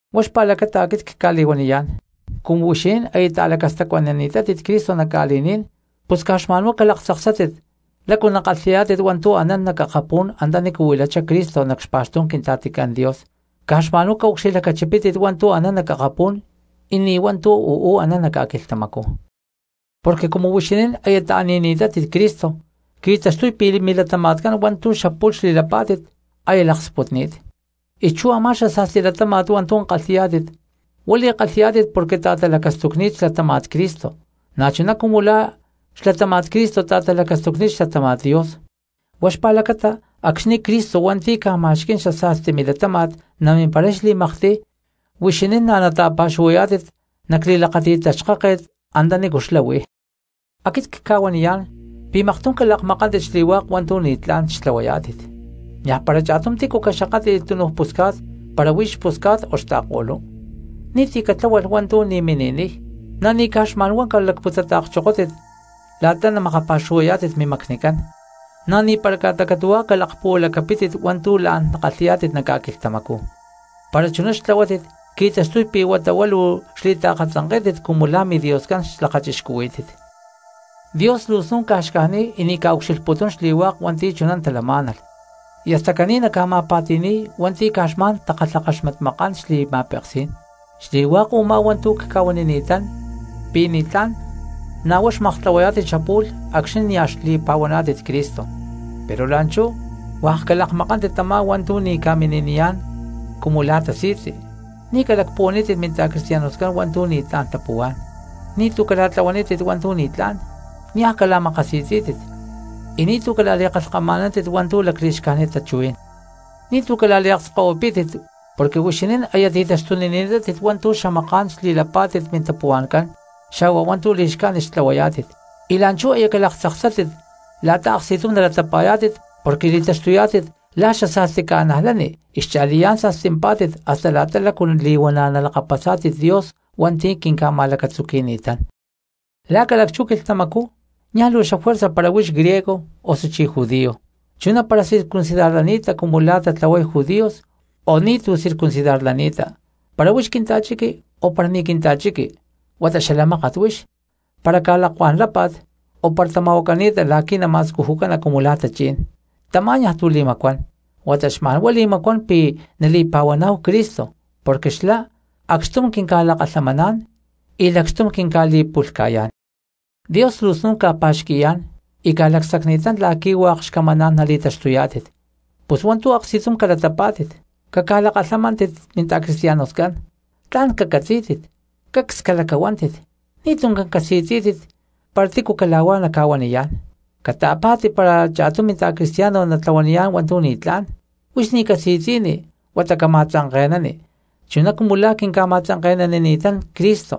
Huá xpa̠lacata aquit cca̠li̠huaniyá̠n, cumu huixinín aya ta̠lacastacuanani̠tátit Cristo nac ca̠li̠ní̠n, pus caj xma̠nhuá calaktzaksátit lácu nakalhi̠yá̠tit hua̠ntu̠ anán nac akapú̠n antanícu huilachá Cristo nac xpa̠xtú̠n Quintla̠ticán Dios. Caj xma̠nhuá caucxilhlacachipítit hua̠ntu̠ anán nac akapú̠n y ni̠ hua̠ntu̠ uú anán nac ca̠quilhtamacú. Porque cumu huixinín aya ta̠ni̠ni̠tátit Cristo qui̠taxtuy pi̠ milatama̠tcán hua̠ntu̠ xapu̠lh xli̠lapá̠tit aya laksputni̠t, y chú a̠má xasa̠sti latáma̠t hua̠ntu̠ kalhi̠yá̠tit huá li̠kalhi̠yá̠tit porque ta̠talacastucni̠t xlatáma̠t Cristo, na̠chuná cumu la̠ xlatáma̠t Cristo ta̠talacastucni̠t xlatáma̠t Dios. Huá xpa̠lacata acxni̠ Cristo hua̠nti̠ ca̠ma̠xquí̠n xasa̠sti milatáma̠t namimparay xli̠maktiy huixinín na̠ nata̠pa̠xuhuayá̠tit nac li̠lakáti̠t taxkáket antanícu xlá huí. Aquit cca̠huaniyá̠n pi̠ maktum calakmakántit xli̠hua̠k hua̠ntu̠ ni̠tlá̠n xtlahuayá̠tit: niaj para cha̠tum tícu caxakátli̠lh túnuj pusca̠t para huí xpusca̠t o xta̠ko̠lú, y ni̠ti̠ catláhualh hua̠ntu̠ ni̠ mini̠niy, na̠ ni̠ caj xma̠n huá calacputzata̠kchokótit la̠ta namakapa̠xuhuayá̠tit mimacnicán, na̠ ni̠para ca̠ta catu̠huá calakpuhualacapítit hua̠ntu̠ la̠n nakalhi̠yá̠tit nac ca̠quilhtamacú, para chuná xtlahuátit qui̠taxtuy pi̠ huata huá luu xli̠taakatzanké̠tit cumu la̠ midioscán xlakachixcuhuí̠tit. Dios luu snu̠n xcajniy y ni̠ ca̠ucxilhputún xli̠hua̠k hua̠nti̠ chuná talamá̠nalh, y hasta caní naca̠ma̠pa̠ti̠ni̠y hua̠nti̠ caj xma̠n takalhakaxmatmakán xli̠ma̠peksí̠n. Xli̠hua̠k u̠má hua̠ntu̠ cca̠huanini̠tán pi̠ ni̠tlá̠n na̠ huá xmaktlahuayá̠tit xapu̠lh acxni̠ nia̠ xli̠pa̠huaná̠tit Cristo. Pero la̠nchú hua̠k ca̠lakmakántit tamá hua̠ntu̠ ni̠ ca̠mini̠niyá̠n cumu la̠ tasi̠tzi, ni̠tu̠ calacpuhuanítit minta̠cristianoscán hua̠ntu̠ ni̠tlá̠n tapuhuá̠n, ni̠tu̠ cala̠tlahuanítit hua̠ntu̠ ni̠tlá̠n, niaj cala̠makasi̠tzí̠tit, y ni̠tu̠ cala̠li̠kalhkama̠nántit hua̠ntu̠ lacli̠xcájnit tachuhuí̠n. Ni̠tu̠ cala̠liakskahuipí̠tit porque huixinín aya ti̠taxtunini̠tátit hua̠ntu̠ xamaká̠n xli̠lapá̠tit mintapuhua̠ncán xa̠hua hua̠ntu̠ li̠xcájnit xtlahuayá̠tit, y la̠nchú aya calaktzaksátit huá la̠ta aksti̠tum nalatapa̠yá̠tit porque li̠taxtuyá̠tit la̠ xasa̠sti cristianos, y cha̠liyá̠n sa̠stimpá̠tit hasta la̠ta lácu li̠huana̠ nalakapasá̠tit Dios hua̠nti̠ quinca̠ma̠lacatzuqui̠ni̠tán. La̠ ca̠lacchú quilhtamacú niaj luu xafuerza para huix griego, osuchí judío, chuná para circuncidarlani̠ta cumu la̠ tatlahuay judíos o ni̠tu̠ circuncidarlani̠ta; para huix quinta̠chiqui o para ni̠ quinta̠chiqui huata xala mákat huix, para ca̠lakuá̠n lápa̠t o para tama̠huacani̠ta la̠qui̠ nama̠scujucana cumu la̠ tachí̠n, tamá niaj tu̠ li̠macuán, huata xma̠n huá li̠macuán pi̠ nali̠pa̠huaná̠hu Cristo, porque xlá acxtum quinca̠lakalhamaná̠n y lacxtum quinca̠li̠pu̠lhca̠yá̠n. Dios luu snu̠n ca̠pa̠xqui̠yá̠n y ca̠lacsacni̠tán la̠qui̠ hua̠k xcamaná̠n nali̠taxtuyá̠tit. Pus hua̠ntu̠ aksti̠tum calatapá̠tit, caca̠lakalhamántit minta̠cristianoscán, tla̠n cacatzí̠tit, cacs calacahuántit, ni̠tuncán casi̠tzí̠tit para tícu cala̠huá naca̠huaniyá̠n. Cata̠pa̠ti para cha̠tum minta̠cristiano natlahuaniyá̠n hua̠ntu̠ ni̠tlá̠n, huix ni̠ casi̠tzi̠ni huata cama̠tzanke̠nani, chuná cumu la̠ quinca̠ma̠tzanke̠nanini̠tán Cristo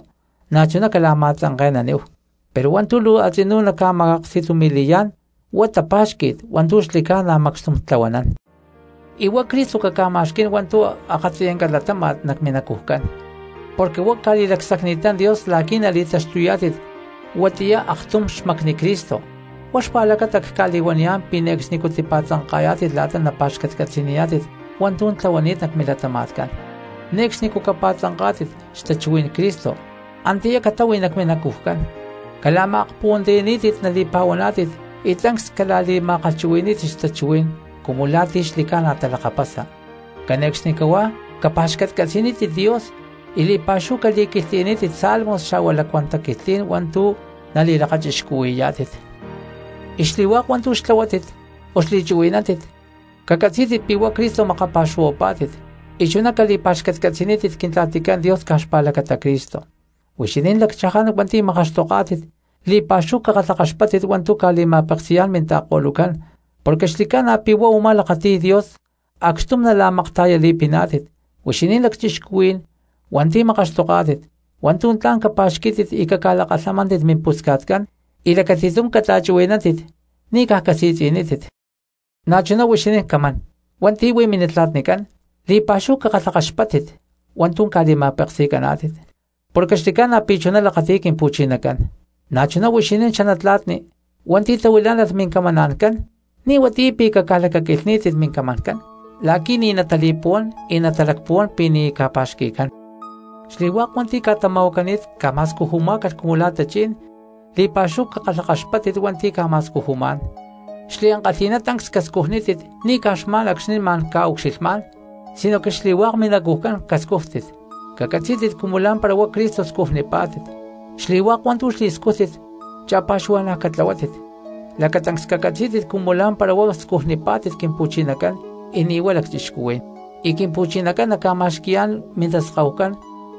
na̠chuná cala̠ma̠tzanke̠naníhu. Pero hua̠ntu̠ luu a̠tzinú naca̠ma̠aksti̠tumi̠li̠yá̠n huá tapa̠xqui̠t hua̠ntu̠ xli̠ca̠na macxtum tlahuanán. Y huá Cristo caca̠ma̠xquí̠n hua̠ntu̠ akatziyanca latáma̠t nac minacujcán porque huá ca̠li̠lacsacni̠tán Dios la̠qui̠ nali̠taxtuyá̠tit huatiyá aktum xmacni Cristo, huá xpa̠lacata cca̠li̠huaniyá̠n pi̠ ne̠cxnicú tipa̠tzanka̠yá̠tit la̠ta napa̠xcatcatzi̠niyá̠tit hua̠ntu̠ tlahuani̠t nac milatama̠tcán. Ne̠cxnicú capa̠tzanká̠tit xtachuhuí̠n Cristo, antiyá catahui nac minacujcán. Cala̠ma̠akpuhuantiyaní̠tit nali̠pa̠huaná̠tit y tancs cala̠li̠ma̠kalhchuhui̠ní̠tit xtachuhuí̠n cumu la̠ ti̠ xli̠ca̠na talakapasa. Cane̠cxnicahuá capa̠xcatcatzi̠nítit Dios y li̠pa̠xúhu caquilhtli̠nítit salmos xa̠hua lacuán taquilhtlí̠n hua̠ntu̠ nali̠lakachixcuhui̠yá̠tit. Y xli̠hua̠k hua̠ntu̠ xtlahuátit o xli̠chuhui̠nántit, cacatzí̠tit pi̠ huá Cristo makapa̠xuhuapá̠tit y chuná cali̠pa̠xcatcatzi̠nítit Quintla̠ticán Dios caj xpa̠lacata Cristo. Huixinín lacchaján hua̠nti̠ makaxtoká̠tit, li̠pa̠xúhu cakalhakaxpáttit hua̠ntu̠ ca̠li̠ma̠peksi̠yá̠n minta̠ko̠lucán, porque xli̠ca̠na pi̠ huá u̠má lakati̠y Dios acxtum nala̠makta̠yali̠piná̠tit. Huixinín lacchixcuhuí̠n hua̠nti̠ makaxtoká̠tit, hua̠ntu̠ tla̠n capa̠xquí̠tit y caca̠lakalhamántit mimpusca̠tcán y lacati̠tum cata̠chuhui̠nántit ni̠ caj casi̠tzi̠nítit. Na̠chuná huixinín camán hua̠nti̠ huí minatla̠tnicán, li̠pa̠xúhu cakalhakaxpáttit hua̠ntu̠ ca̠li̠ma̠peksi̠caná̠tit, porque xli̠ca̠na pi̠ chuná lakati̠y Quimpu̠chinacán. Na̠chuná huixinín xanatla̠tni hua̠nti̠ tahuilá̠nalh mincamancán, ni̠ huatiyá pi̠ caca̠lacaquilhní̠tit mincamancán la̠qui̠ ni̠ natali̠puhuán y natalacpuhuán pi̠ ni̠ ca̠pa̠xqui̠cán. Xli̠hua̠k hua̠nti̠ ca̠tama̠huacani̠t ca̠ma̠scujumá̠calh cumu la̠ tachí̠n, li̠pa̠xúhu cakalhakaxpátit hua̠nti̠ ca̠ma̠scujumá̠n, xliankalhi̠ná tancs cascujnítit ni̠ caj xma̠n acxni̠ ma̠n ca̠ucxilhmá̠n sinoque xli̠hua̠k minacujcán cascújtit, cacatzí̠tit cumu lá̠mpara huá Cristo scujnipá̠tit. Xli̠hua̠k hua̠ntu̠ xli̠scújtit cha̠pa̠xuhua̠na̠ catlahuátit, lacatancs cacatzí̠tit cumu lá̠mpara huá scujnipá̠tit Quimpu̠chinacán y ni̠ huá lacchixcuhuí̠n, y Quimpu̠chinacán naca̠ma̠xqui̠yá̠n mintaskahucán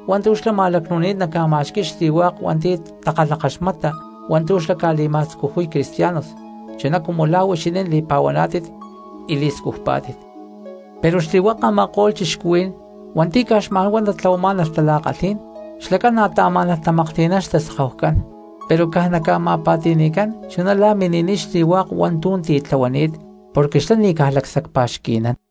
hua̠ntu̠ xlá ma̠lacnu̠ni̠t naca̠ma̠xqui̠y xli̠hua̠k hua̠nti̠ takalhakaxmata hua̠ntu̠ xlá ca̠li̠ma̠scujuy cristianos chuná cumu la̠ huixinín li̠pa̠huaná̠tit y li̠scujpá̠tit. Pero xli̠hua̠k a̠ma̠ko̠lh cristianos hua̠nti̠ caj xma̠n huá tatlahuamá̠nalh tala̠kalhí̠n, xlacán na̠ taamá̠nalh tamaklhti̠nán xtaskahucán pero caj naca̠ma̠pa̠ti̠ni̠cán chuná la̠ mini̠niy xli̠hua̠k hua̠ntu̠ titlahuani̠t, porque xlá ni̠ caj lacsacpa̠xqui̠nán.